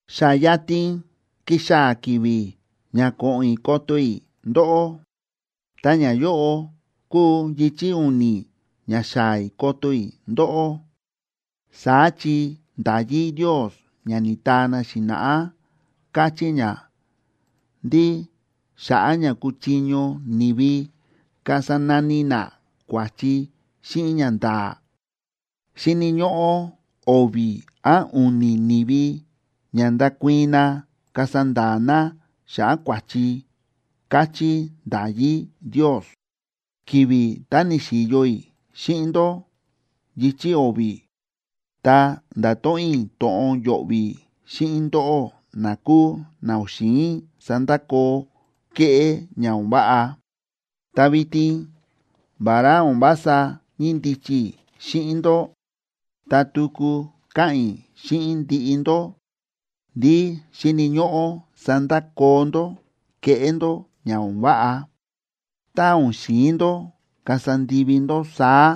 Xa yatin kixaa̱ ki̱vi̱ ña ko̱ꞌo̱n i̱ koto i̱ ndóꞌó, ta ñayóꞌo kuu yichi̱ u̱ni̱ ña xaa̱ i̱ koto i̱ ndóꞌó. Saá chi nda̱yí Ndios ña ni̱taa na xi̱na̱ꞌá káchí ña ndí xa̱ꞌa̱ ña kuchiño ni̱vi kasa nani na kua̱chi xíꞌin ñanda̱a̱, xíni̱ ñóꞌó o̱vi̱ án u̱ni̱ ni̱vi ña ndakuii̱n na kasa nda̱a̱ na xa̱ꞌa̱ kua̱chi, káchí nda̱yí Ndios. Ki̱vi̱ tá ni̱xi̱yo i̱ xíꞌin ndó yichi̱ o̱vi̱, ta nda̱to̱ꞌon i̱ to̱ꞌon yo̱ꞌvi̱ xíꞌin ndóꞌó na kúu na o̱n xi̱in sandakoo kéꞌé ña o̱n váꞌa. Ta vitin vará o̱n vása ñíndichi i̱ xíꞌin ndó, ta tuku káꞌa̱n i̱ xíꞌin ndiꞌi ndó ndí xíni̱ ñóꞌó sandakoo ndó kéꞌé ndó ña o̱n váꞌa. Tá o̱n xi̱in ndó kasa ndivi ndó saá,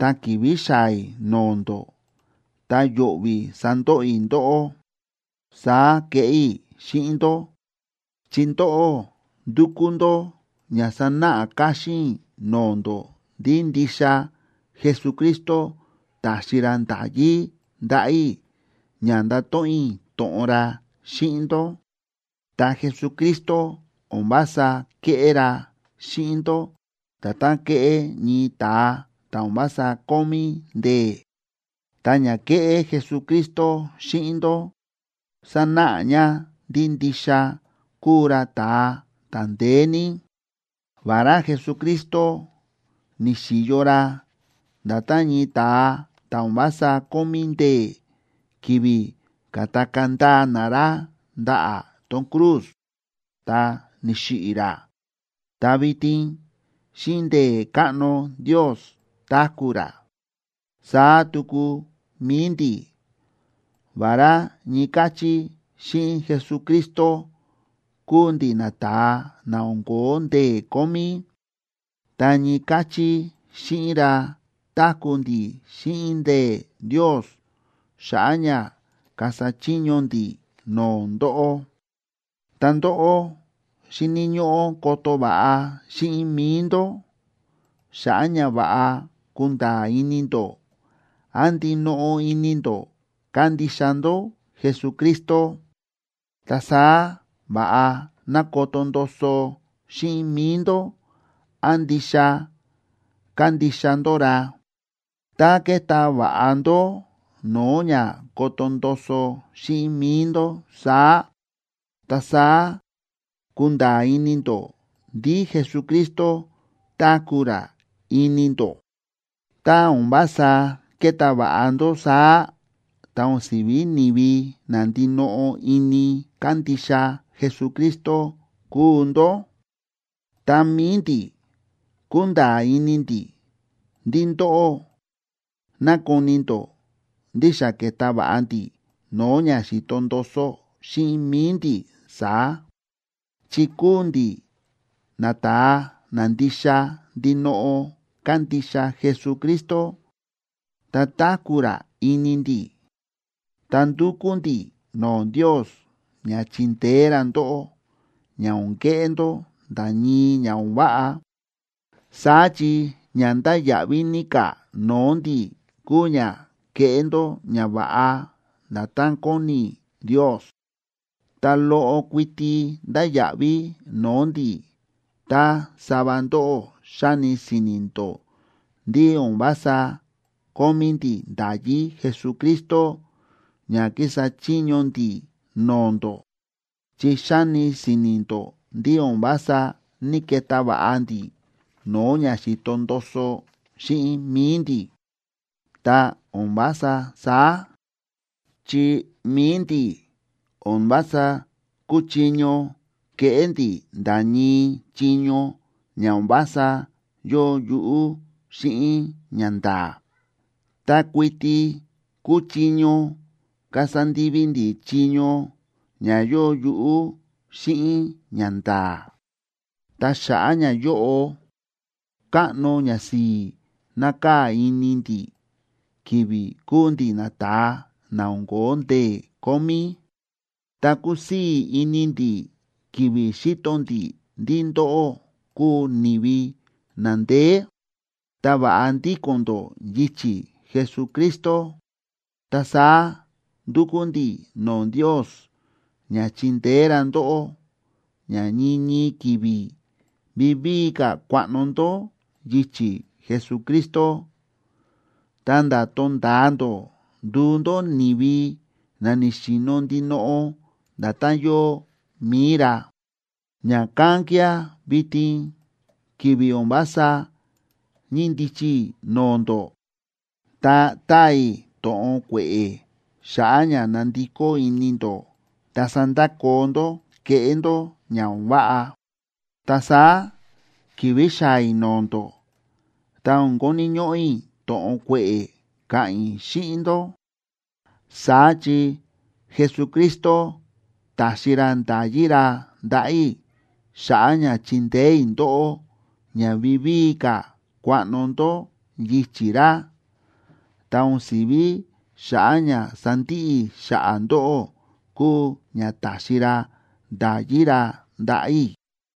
ta ki̱vi̱ xaa̱ i̱ no̱o̱ ndó, ta yo̱ꞌvi̱ sandoꞌo i̱ ndóꞌó. Saá keꞌé i̱ xíꞌin ndó, chi ndóꞌó ndúkú ndó ña sanáꞌa káxín i̱ no̱o̱ ndó ndí ndixa Jesucristo ta̱xi ra nda̱yí ndaꞌa̱ i̱ ña ndato̱ꞌon i̱ to̱ꞌon ra xíꞌin ndó. Ta Jesucristo o̱n vása kéꞌé ra xíꞌin ndó nda̱tán kéꞌé ñii ta̱a ta̱ o̱n vása kómí ndee̱, ta ña kéꞌé Jesucristo xíꞌin ndó sánáꞌa ña ndí ndixa kúu ra ta̱a ta̱ ndeé ní. Vará Jesucristo ni̱xi̱yo ra nda̱tán ñii ta̱a ta̱ o̱n vása kómí ndee̱ ki̱vi̱ ka̱takaa̱ ndaa na ra ndaꞌa̱ tón cruz, ta ni̱xiꞌi̱ ra, ta vitin xíꞌin ndee̱ káꞌno Ndios táku̱ ra. Saá tuku mi̱i ndi̱, vará ñii káchí xíꞌin Jesucristo kúu ndi̱ nata̱a na o̱n ko̱ó ndee̱ kómí, ta ñii káchí xíꞌin ra táku̱ ndi̱ xíꞌin ndee̱ Ndios xa̱ꞌa̱ ña kasa chiño ndi̱ no̱o̱ ndóꞌó. Ta ndóꞌó xíni̱ ñóꞌó koto va̱ꞌa xíꞌin mi̱i ndó, xa̱ꞌa̱ ña va̱ꞌa kunda̱a̱ ini ndó án ndinoꞌo ini ndó kándixa ndó Jesucristo. Ta saá va̱ꞌa ná koto ndoso xíꞌin mi̱i ndó án ndixa kándixa ndó ra. Tá keta va̱ꞌa ndó no̱o̱ ña koto ndoso xíꞌin mi̱i ndó saá, ta saá kunda̱a̱ ini ndó ndí Jesucristo táku̱ ra ini ndó. Tá o̱n vása keta va̱ꞌa ndó saá, ta o̱n si̱ví ni̱vi na ndinoꞌo ini kándixa Jesucristo kúu ndó. Ta mi̱i ndi̱, kúnda̱a̱ ini ndi̱ ndí ndóꞌó nákoni ndó ndí xa ke̱ta va̱ꞌa ndi̱ no̱o̱ ña xi̱to ndoso xíꞌin mi̱i ndi̱ saá, chi kúu ndi̱ nata̱a na ndixa ndinoꞌo kándixa Jesucristo, ta táku̱ ra ini ndi̱. Ta ndúkú ndi̱ no̱o̱ Ndios ña chindeé ra ndóꞌó, ña o̱n keꞌé ndó nda̱ ñii ña o̱n váꞌa. Saá chi ña ndáya̱ꞌví ní ka̱ no̱o̱ ndi̱ kúu ña kéꞌé ndó ñava̱ꞌa nda̱tán kóni Ndios. Ta loꞌo kuiti ndáya̱ꞌví no̱o̱ ndi̱ tá sava ndóꞌó xáni si̱ni̱ ndó ndí o̱n vása kómí ndi̱ nda̱yí Jesucristo ña kísa chiño ndi̱ no̱o̱ ndó, chi xáni si̱ni̱ ndó ndí o̱n vása ní‑keta va̱ꞌa ndi̱ no̱o̱ ña xi̱to ndoso xíꞌin mi̱i ndi̱. ¡Ta o̱n vása saá! Chi mi̱i ndi̱, o̱n vása kúchiño keꞌé ndi̱ nda̱ ñii chiño ña o̱n vása yóo yuꞌú xíꞌin ñanda̱a̱. Ta kuiti kúchiño kasa ndivi ndi̱ chiño ña yóo yuꞌú xíꞌin ñanda̱a̱. Ta xa̱ꞌa̱ ñayóꞌo, káꞌno ñasi̱i̱ nákaa̱ ini ndi̱ ki̱vi̱ kúu ndi̱ nata̱a na o̱n ko̱ó ndee̱ kómí, ta kúsii̱ ini ndi̱ ki̱vi̱ xíto ndi̱ ndí ndóꞌó kúu ni̱vi na ndeé, ta va̱ꞌa ndíko̱n ndó yichi̱ Jesucristo. Ta saá ndúkú ndi̱ no̱o̱ Ndios ña chindeé ra ndóꞌó ña ñii ñii ki̱vi̱ vivíi ka̱ kuaꞌno ndó yichi̱ Jesucristo, ta̱nda̱ tonda̱a ndó nduu ndó ni̱vi na ni̱xi̱no̱ ndinoꞌo nda̱tán yóo mi̱i ra. Ña̱kán kía̱ vitin ki̱vi̱ o̱n vása ñíndichi i̱ no̱o̱ ndó, ta táa i̱ to̱ꞌon kue̱ꞌe̱ xa̱ꞌa̱ ña nandikó ini ndó ta sandakoo ndó kéꞌé ndó ña o̱n váꞌa. Ta saá ki̱vi̱ xaa̱ i̱ no̱o̱ ndó, ta o̱n koni̱ ñóꞌó i̱ to̱ꞌon kue̱ꞌe̱ ka̱ꞌa̱n i̱ xíꞌin ndó. Saá chi Jesucristo ta̱xi ra nda̱yí ra ndaꞌa̱ i̱ xa̱ꞌa̱ ña chindeé i̱ ndóꞌó ña vivíi ka̱ kuaꞌno ndó yichi̱ ra, ta o̱n si̱ví xa̱ꞌa̱ ña sandiꞌi i̱ xa̱ꞌa̱ ndóꞌó kúu ña ta̱xi ra nda̱yí ra ndaꞌa̱ i̱.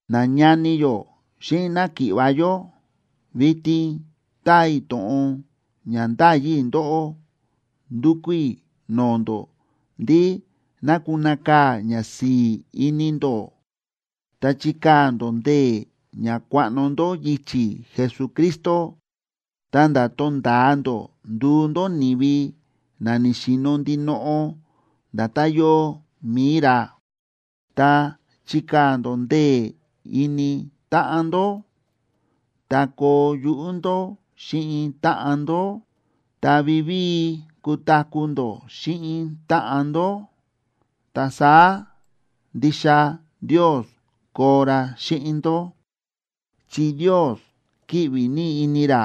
Nañani yó xíꞌin náki̱ꞌva̱ yó, vitin táa i̱ to̱ꞌon ña ndáyi i̱ ndóꞌó. Ndúkú i̱ no̱o̱ ndó ndí ná kunakaa̱ ñasi̱i̱ ini ndó, ta chikaa̱ ndó ndee̱ ña kuaꞌno ndó yichi̱ Jesucristo, ta̱nda̱ tonda̱a ndó nduu ndó ni̱vi na ni̱xi̱no̱ ndinoꞌo nda̱tán yóo mi̱i ra. Ta chikaa̱ ndó ndee̱ ini táꞌan ndó, ta koo yuꞌú ndó xíꞌin táꞌan ndó, ta vivíi kutaku̱ ndó xíꞌin táꞌan ndó. Ta saá ndixa Ndios koo ra xíꞌin ndó, chi Ndios kíꞌvi ní ini ra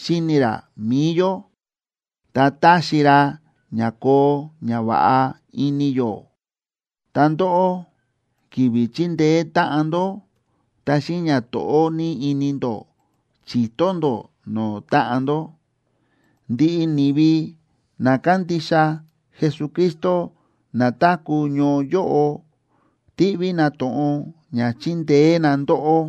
xíni ra mi̱i yó, ta táxi ra ña koo ñava̱ꞌa ini yó. Ta ndóꞌó, ki̱vi̱ chíndeé táꞌan ndó, ta xíꞌin ñato̱ꞌó ní ini ndó chi̱to ndó no̱o̱ táꞌan ndó. Ndiꞌi ni̱vi na kándixa Jesucristo na táku̱ ñoo yóꞌo, tíꞌví na to̱ꞌon ña chindeé na ndóꞌó.